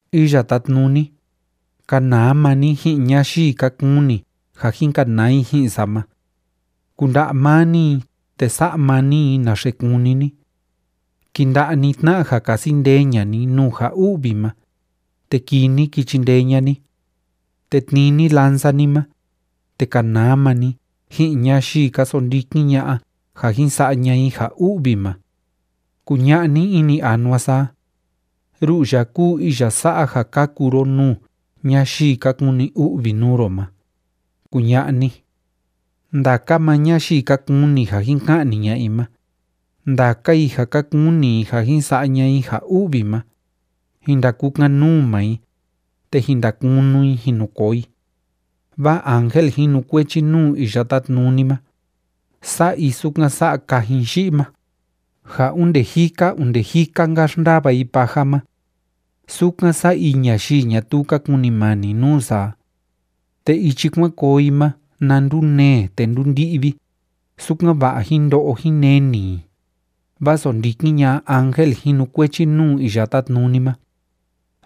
Iya Tátnuni, kanaa maa ni ji'in ñayii ka kuni ja jin kanaa i ji'in sa ma. Kunda'a maa ni i, te sa'a maa ni i naxe kúni ni. Kinda'a ni tna'a ja kasi ndee ña'a ni nuu ja u'vi ma, te kii ni ki chindee ña'a ni. Te tnii ni lanza ni ma, te kanaa maa ni ji'in ñayii ka sondikin ña'a ja jin sa'a ña'a i ja u'vi ma. Kuña'a ni ini anua sa a: “Ru'u ya kúu iya sa'a ja kaku ro nuu ñayii ka kuni u'vi nuu ro ma”, kuña'a ni. Ndaka maa ñayii ka kuni ja jin ka'ni ña'a i ma, ndaka i ja ka kuni i ja jin sa'a ña'a i ja u'vi ma, jin ndakukan‑nuu maa i, te jin ndakunu i jin nu koo i. Vaa ángel jinukuechi nuu Iya Tátnuni ma, sa'a i sukan sa'a kajin yi'i ma, ja onde jika onde jika‑nka xndava i paja ma. Sukan sa'a i ñayii ñatuu ka kunimani nuu sa a. Te ichi kuan koo i ma na ndunee te ndúndi'vi, sukan‑va'a jín ndo'o jín neni i, vaa sondikin ña'a ángel jinukuechi nuu Iya Tátnuni ma.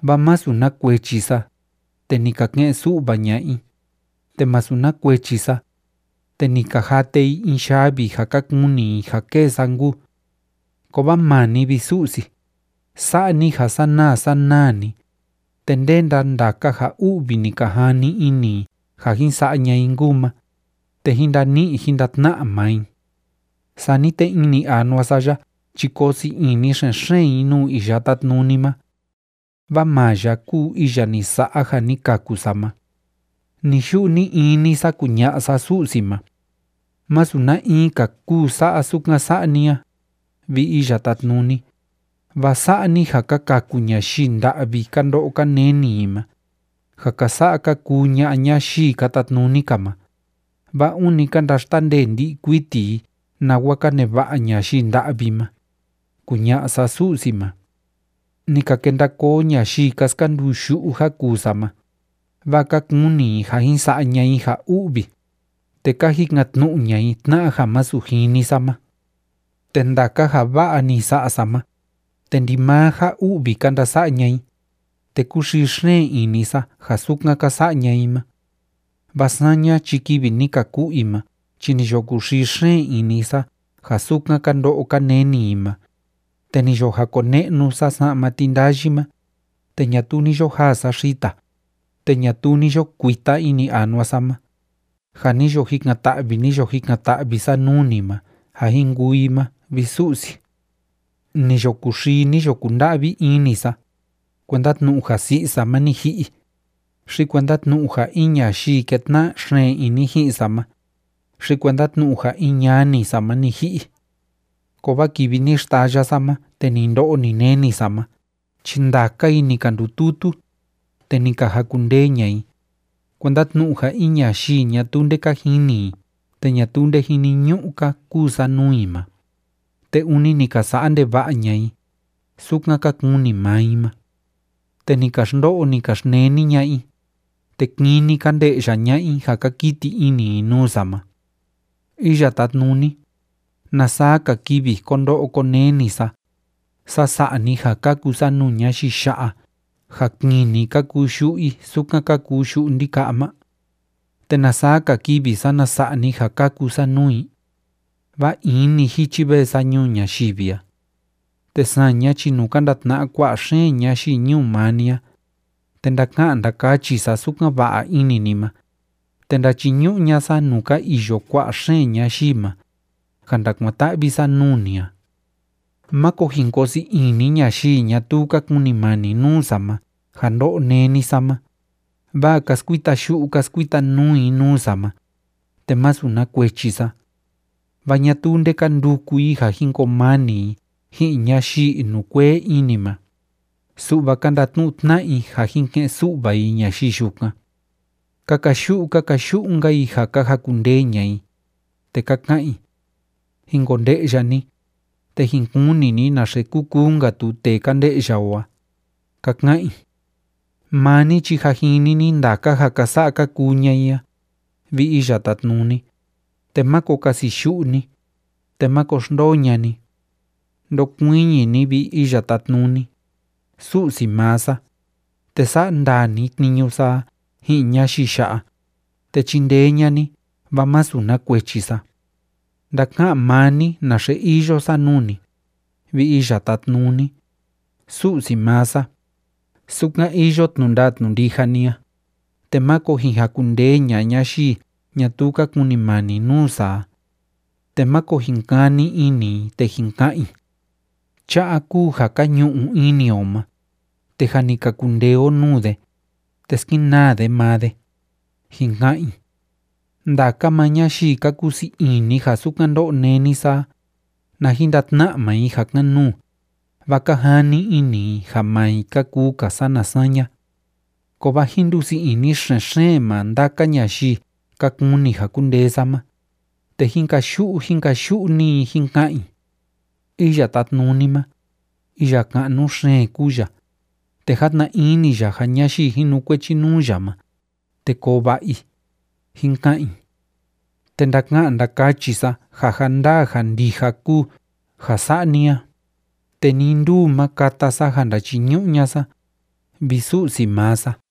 Vaa másu na kuechi sa, te ni ka ke'en‑su'va ña'a i, te masu na kuechi sa, te ni ka jate i in yavi ja ka kuni i ja kêe sa nkuu. Kovaa maa ni, vi Su'si, sa'a ni ja sanaa sanaa‑ni, te ndénda ndaka ja u'vi ni ka jani ini i ja jin sa'a ña'a i nkuu ma, te jín ndani'i jín ndatna'a maa i. Sani te ini anua sa ya chi koo sii ini xen‑xeen i nuu Iya Tátnuni ma, vaa maa ya kúu iya ni sa'a ja ni kaku sa ma. Ni‑yu'u ni‑ini sa kuña'a sa Su'si ma: “Masu na in‑ka kúu sa'a sukan sa'a ni a, vi Iya Tátnuni, vaa sa'a ni ja ka kaku ñayii nda'vi ka ndo'o ka neni i ma, ja ka sa'a ka kuu ña'a ñayii ka tatnuni‑ka ma, vaa ûni ka ndaxtandee ndi'i kuiti i nawa ka neva'a ñayii nda'vi ma”, kuña'a sa Su'si ma. Ni ka kenda koo ñayii ka skanduu yu'u ja kuu sa ma, vaa ka kuni i ja jin sa'a ña'a i ja u'vi, te ka jikan‑tnu'u ña'a i tna'a ja másu jini sa ma. Te ndaka ja va'a ni sa'a sa ma, te ndimaa ja u'vi ka ndasa'a ña'a i, te kúxii xeen ini sa ja sukan ka sa'a ña'a i ma. Vaa saña chi kivi ni ka ku'u i ma chi ni yo kuxii xeen ini sa ja sukan ka ndo'o ka neni i ma, te ni yo jakone'nu sa sa'ma tindayi ma, te ñatuu ni yo jaa sa xita, te ñatuu ni yo kuita ini anua sa ma, ja ni yo jikan‑ta'vi, ni yo jikan‑ta'vi sa nuu ni ma ja jin kuu i ma, vi Su'si. Ni yo kuxii, ni yo kunda'vi ini sa, kuenda tnu'u ja si'i sa ma ni ji'i, xi kuenda tnu'u ja in ñayii kétna'a xeen ini ji'in sa ma, xi kuenda tnu'u ja in ñani sa ma ni ji'i. Kovaa kivi ni xtaya sa ma te ni ndo'o, ni neni sa ma chi ndaka i ni ka ndututu, te ni ka jakundee ña'a i, kuenda tnu'u ja in ñayii ñatuu nde ka jini i te ñatuu nde jiniñu'u‑ka kuu sa nuu i ma, te ûni ni ka sa'a ndeva'a ña'a i, sukan ka kuni maa i ma. Te ni ka xndo'o, ni ka xneni ña'a i, te kini ka nde'ya ña'a i ja ka kiti ini i nuu sa ma. Iya Tátnuni, ¿na saa‑ka kivi ko ndo'o ko neni sa, saa sa'a ni ja kaku sa nuu ñayii ya'a ja kini ka kuu yu'u i sukan ka kuu yu'u ndika'a ma? ¿Te na saa‑ka kivi, sana sa'a ni ja kaku sa nuu i? Vaa in‑ni jichi vee sa ñuu ñayivi a. Te saña chi nuu ka ndatna'a kua'a xeen ñayii ñuu maa ni a, te ndaka'an ndakachi sa sukan va'a ini ni ma, te ndachiñu'u ña'a sa nuu ka iyo kua'a xeen ñayii ma, ja ndakuan‑ta'vi sa nuu ni a. Máko jin koo sii ini ñayii ñatuu ka kunimani nuu sa ma ja ndó'o néni sa ma, vaa ka skuita yu'u ka skuita nuu i nuu sa ma, te masu na kuechi sa. Vaa ñatuu nde ka nduku i ja jin koo mani i ji'in ñayii inukuee ini ma, su'va ka ndatnu'u tna'a i ja jin ke'en‑su'va i ñayii yukan. Ka kayu'u ka kayu'u‑nka i ja ka jakundee ña'a i, te ka ka'an i: “Jin konde'ya ni, te jin kuni ni naxe kuu kuu‑nka tu tee ka nde'ya o a”, ka ka'an i. Maa ni chi jâ jini ni ndaka ja ka sa'a ka kuu ña'a i a, vi Iya Tátnuni, te máko kasiyu'u ni, te máko xndoo ña'a ni. Ndokuiñi ni, vi Iya Tátnuni, Su'si maa sa, te sa'a ndaa ni tniñu sa a ji'in ñayii ya'a, te chindee ña'a ni, vaa masu na kuechi sa. Ndaka'an maa ni naxe iyo sa nuu ni, vi Iya Tátnuni, Su'si maa sa, sukan iyo tnu'u ndaa tnu'u ndija ni a, te máko jin jakundee ña'a ñayii ñatuu ka kunimani nuu sa a. Te máko jin kani ini i te jin ka'an i: “Cha'a kúu ja ka ñu'u ini o ma, te jâ ni ka kundee o nuu de, te skenaa de maa de”, jin ka'an i. Ndaka maa ñayii ka kusii ini ja sukan ndó'o néni sa a, na jin ndatna'a maa i ja kan‑nuu, vaa ka jani ini i ja maa i ka kuu‑ka sana saña. Kovaa jín ndusii ini xen‑xeen maa ndaka ñayii ka kuni ja kundee sa ma, te jín kayu'u jín kayu'u‑ni i jín ka'an i: “Iya Tátnuni ma, iya ka'nu xeen kúu ya, te játna ini ya ja ñayii jinukuechi nuu ya ma, te koo va'a i”, jín ka'an i. Te ndaka'an ndakachi sa ja ja ndaa ja ndija kúu ja sa'a ni a, te nii nduu ma kata sa ja ndachiñu'u ña'a sa, vi Su'si maa sa.